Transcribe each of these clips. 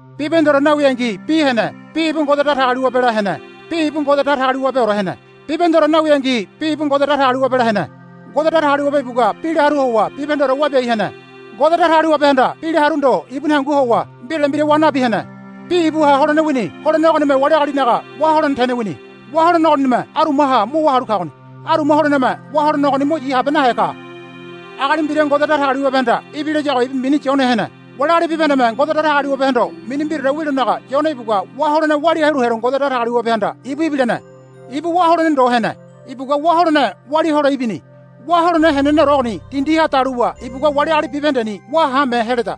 Bibahendeore nawingi Bi hene. Bi ibu Ngode Datagaliwabela hene. Bi ibu Ngode Datagaliwabeore hene. Bibahendeore nawingi Bi ibu Ngode Datagaliwabela hene. Ngode Datagaliwabe ibugua Bila haru howa bibahendeore wabiai hene. Ngode Datagaliwabehanda Bila haru ndo ibuni hangu howa mbirale mbira wa nabi hene. Bi ibuha holene wini. Holene ogonime wali agalinaga wá holene tene wini. Wá holene ogonime arumaha mo wá halu kagoni. Aruma holeneme wá holene ogoni mo yi habe nahe ka. Agali mbira Ngode Datagaliwabehanda ibilayago ibu mini Yone hene. Wali agali bibahendeme Ngode Datagaliwabehondo mini mbiraore wilonaga Yone ibugua wá holene walia helo Ngode Datagaliwabehanda ibu ibilene. Ibu wá holene ndo hene. Ibugua wá holene walia hole ibini. Wá holene heneneore ogoni dindiha daluwa ibugua wali agali bibahendeni wá haame heleda.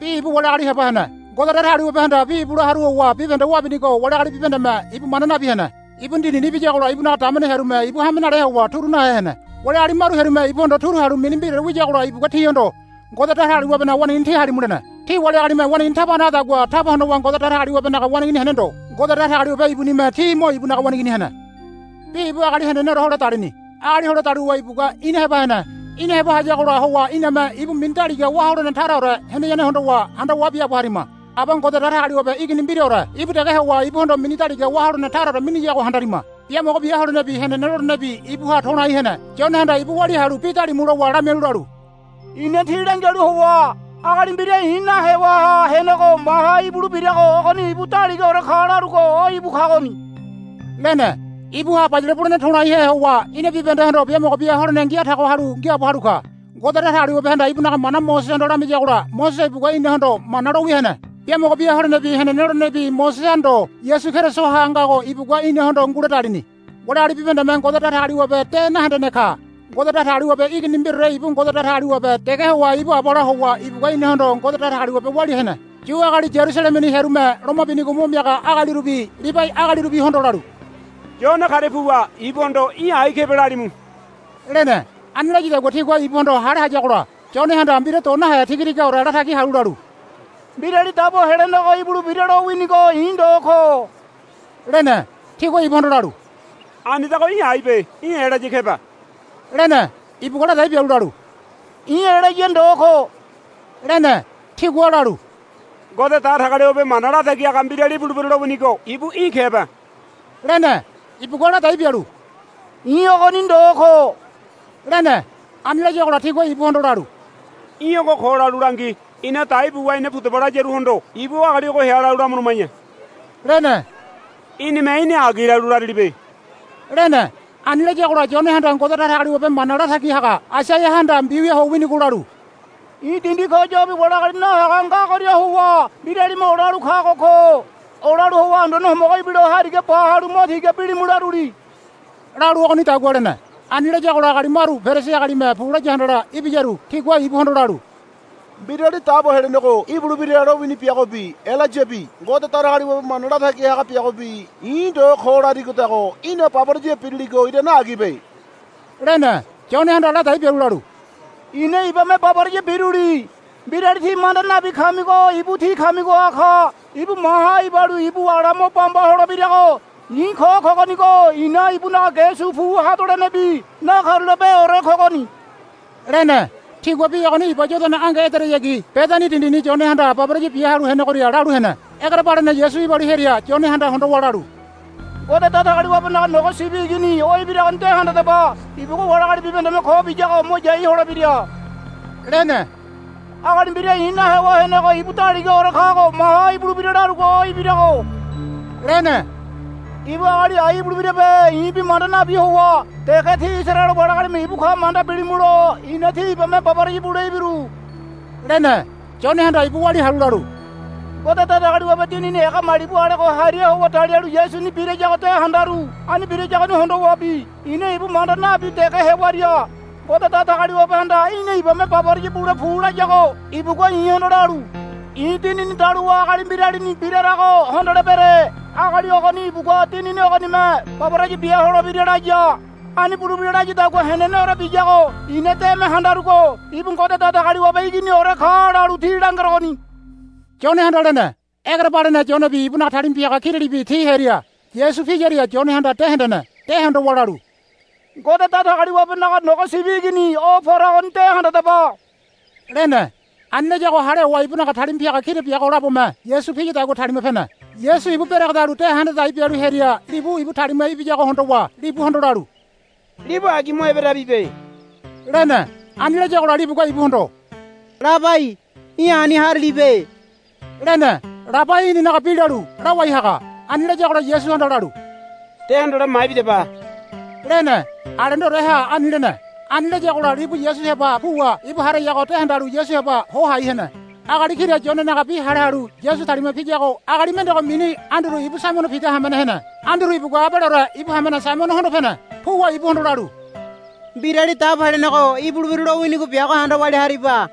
Bi ibu wali agali heba hene. Ngode Datagaliwabehanda Bi ibula haru howa bibahende wabinigo wali agali bibahendeme ibu manda nabi hene. Ibuni dindini ibiyagola ibunaga damene hearume ibu hame nale howa turu nahe hene. Wali agali maru hearume ibuhondo turu halu mini mbiraore wiyagola ibugua tihondo, Ngode Datagaliwabenaga waneigini tí halimu, lene. Ti wali agalime waneigini taba hanagadagua taba honowa Ngode Datagaliwabenaga waneigini hene ndo. Ngode Datagaliwabe ibunime ti mo ibunaga waneigini hene. Bi ibu agali heneneore hole dalini. Agali hole daluwa ibugua ina heba hene. Ina heba hayagola howa iname ibu mini daliga wá holene taraore heneyane hondowa handawa biaabo harima. Aba Ngode Datagaliwabe Igini mbiraore ibu dege howa ibuhondo mini daliga wá holene taraore miniyago handarima. Biamogo bia holenebi henene lolenebi ibuha to̱laihe hene. Yonehanda ibu walia halu bi dalimu lowa lamialu lalu, I̱na tí langialu howa agali mbira i̱ nahewaha henego maha ibulebirago ogoni ibu daligaore ka larugo o íbu kagoni, lene. Ibuha bayale bulene to̱laihe howa ina bibahendehondo biamogo bia holene ngia tago halu ngiaabo halu ka. Ngode Datagaliwabehanda ibunaga mana Mosesehondo lamiyagola Mosese ibugua inahondo Mana lo wia hene. Biamogo bia holenebi henene lolenebi Moseseha ndo Yasu Kerisoha ngago ibugua inahondo ngule dalini. Wali agali bibahendeme Ngode Datagaliwabe de nahendene ka. Ngode Datagaliwabe Igini mbiraore ibu Ngode Datagaliwabe dege howa ibu Abala howa ibugua inahondo Ngode Datagaliwabe walia hene. Yu agali Yarusalemeni hearume loma binigo mo miaga agalirubi Libai agalirubihondo lalu, Yone karia puwa ibuhondo í̠ ai kebe lalimu, lene. Ani layadagua tigua ibuhondo hale hayagola Yonehanda mbira do nahe tiga tigaore latagi halu lalu, Mbirali Dabo Helenego ibulebira lowinigo i̱ ndo ko, lene. Tigua ibuhondo lalu, Anidago í̠ aibe. Í̠ Elaya kebe, lene. Ibugua ladai bialu lalu, I̱ Elaya ndo ko, lene. Tigua lalu, Ngode Datagaliwabe Mana Latagi Haga Mbirali ibulebira lowinigo ibu í̠ kebe, lene. Ibugua ladai bialu, I̱ ogoni ndo ko, lene. Ani layagola tigua ibuhondo lalu, Í̠ ogo ko, lalu langi. Ina dai buwa ina pudaba layaruhondo ibu agali ogo hea lalu lamuluma̱ya, lene. Í̠nime í̠ni agi lalu larilibe, lene. Ani layagola Yonehanda Ngode Datagaliwabe mana latagi haga Aisaiahanda mbiwia ho winigo lalu, I̱ dindi ko yobi wali agali nahaga ngagoria howa mbiralime olalu kago ko. Olalu howa Anduane Homogo ibilo hariga ba halu mo tiga bilimu, laruli, lalu ogonidagua lene. Ani layagola agali maru Perisi agalime pu laya handala ibiyaru tigua ibuhondo lalu, Mbirali Dabo Helenego ibulebira lowini biagobi Elayabi Ngode Datagaliwabe Mana Latagi haga biagobi i̱ ndo ko larigodago í̠na baboraya biriligo irane agibe, lene. Yonehanda ladai bialu lalu, I̱na ibame baboraya biruli. Mbirali tí manda nabi kamigo ibu tí kamigoha ka. Ibu maha ibalu ibu ala mo bamba holebirago i̱ ko kogonigo i̱na ibunaga ge su pu hadolenebi nakarulapeore kogoni, lene. Tigua bi ogoni Iba Yodana ange ederayagi Bedani dindini Yonehanda baboraya bia halu henegoria lalu hene. Egerebalene Yasu ibalu hearia Yonehanda hondowa lalu, Ngode Datagaliwabenaga Nogo Sibi Igini o ibiragoni de handadaba. Ibugua wali agali bibahendeme ko biyago mo yai holebira, lene. Agali mbira i̱ nahewaha henego ibu daligaore kago maha ibulebira larugo o ibirago, lene. Ibu agali ai ibulebirabe i̱bi manda nabi howa dege tí Isaraele wali agalime ibu ka manda bilimulo i̱na tí ibame baboraya bule ibiru, lene. Yonehanda ibu walia halu lalu, Ngode Datagaliwabe Dinini ega malibu alego hariha howa dalialu Yasuni birayago de handaru. Ani birayagoni hondowabi i̱na ibu manda nabi dege hewaria Ngode Datagaliwabehanda, Í̠na ibame baboraya bule pu, layago ibugua i̱hondo lalu, I̱ Dinini daluwa agali mbiralini birarago hondolebere. Agali ogoni ibugua Dinini ogonime baboraya bia holebira, laya. Ani bulebira layadagua heneneore biyago i̱na deme handarugo ibu Ngode Datagaliwabe Iginiore ka lalu tí langerogoni, Yonehanda lene. Egerebalene Yonebi ibunaga talima piaga kiralibi ti hearia Yasu piyaria Yonehanda de hendene. De hondowa lalu, Ngode Datagaliwabenaga Nogo Sibi Igini o poragoni de handadaba, lene. Ani layago hale howa ibunaga talima piaga kira biago labome Yasu piyadagua talima pene. Yasu ibu beregedalu de handa dai bialu hearia libu ibu talima ibiyago hondowa libuhondo lalu, Libu agi mo eberabibe, lene. Ani layagola libugua ibuhondo, Labai, í̠ ani harilibe, lene. Labai inanaga bi lalu, Lawai haga. Ani layagola Yasuhanda lalu, De hondole maibidaba, lene. Alendoreha ani lene. Ani layagola libu Yasu heba puwa ibu harayago de handalu Yasu heba ho hai hene. Agali kira Yonenaga bi hale halu Yasu talima piyago agali mendego mini Anduru ibu Saimono Pida hamene hene. Anduru ibugua abaleore ibu hamene Saimono hondo pene. Puwa ibuhondo lalu, Mbirali Dabo Helenego ibulebira lowinigo biago handa walia hariba,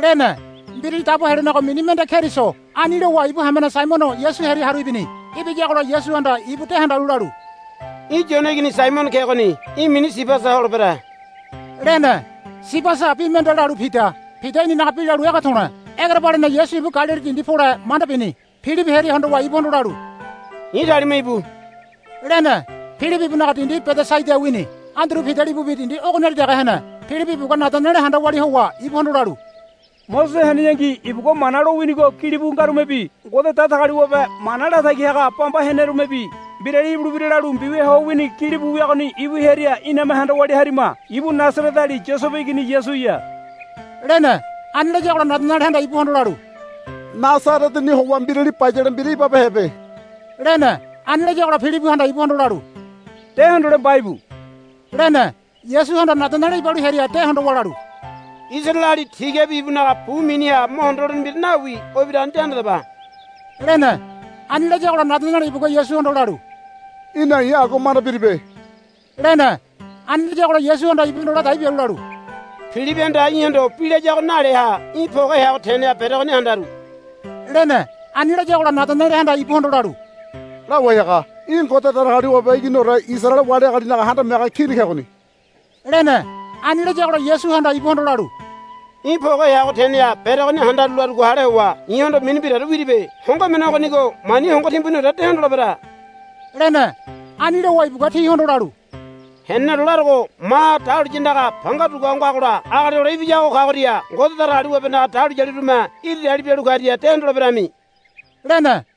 lene. Mbirali Dabo Helenego mini mende Keriso. Ani lowa ibu hamene Saimono Yasu hearia haru ibini. Ibiyagola Yasuhanda ibu de handalu lalu, Í̠ Yone igini Saimono kegoni. Í̠ mini Sibasa holebere, lene. Sibasa bi mende lalu Pida. Pida inanaga bi lalu, Ege To̱le̱. Egerebalene Yasu ibu Galili dindi pole manda bini. Pilibi hearia hondowa ibuhondo lalu, I̱ talima íbu, lene. Pilibi ibunaga dindi Bedesaida wini. Anduru Pida libubi dindi ogoniali dege hene. Pilibi ibugua Nadanele handa walia howa ibuhondo lalu, Mosese heneyangi ibugua Mana lowinigo gilibu ngarumebi Ngode Datagaliwabe mana latagi haga bamba henerumebi mbirali ibulebira lalu mbiwia ho wini gilibu wiagoni ibu hearia iname handa walia harima. Ibu Nasareteali Yosebe igini Yasuya, lene. Ani layagola Nadanelehanda ibuhondo lalu, Nasareteni howa mbirali bayale mbira ibabehebe, lene. Ani layagola Pilibihanda ibuhondo lalu, De hondole mbaibu, lene. Yasuhanda Nadanele ibalu hearia de hondowa lalu, Isaraeleali tigabi ibunaga bu miniha mo hondo holene mbira nawi o ibiragoni de handadaba, lene. Ani layagola Nadanele ibugua Yasuhondo lalu, Í̠na i̱ agua manda biribe, lene. Ani layagola Yasuhanda ibuhondo ladai bialu lalu, Pilibihanda í̠hondo bi layago naleaha í̠ poge heago teneha beregoni handaru, lene. Ani layagola Nadanelehanda ibuhondo lalu, Lawai haga í̠ Ngode Datagaliwabe Iginiore Isaraele wali agalinaga Handame Haga Kini kegoni, lene. Ani layagola Yasuhanda ibuhondo lalu, Í̠ poge heago teneha beregoni handaru larugo hale howa i̱hondo mini mbiraore wiribe. Hongo emene ogonigo mani hongo timbuniore de hondolebere, lene. Ani lowa ibugua tihondo lalu, Heneneore larogo. Maha dahuliya andaga panga dugua ho ngagola Agali Hole Ibiyago kagoria Ngode Datagaliwabenaga dahuliyalirume iri dali bialu karia de hondoleberami, lene.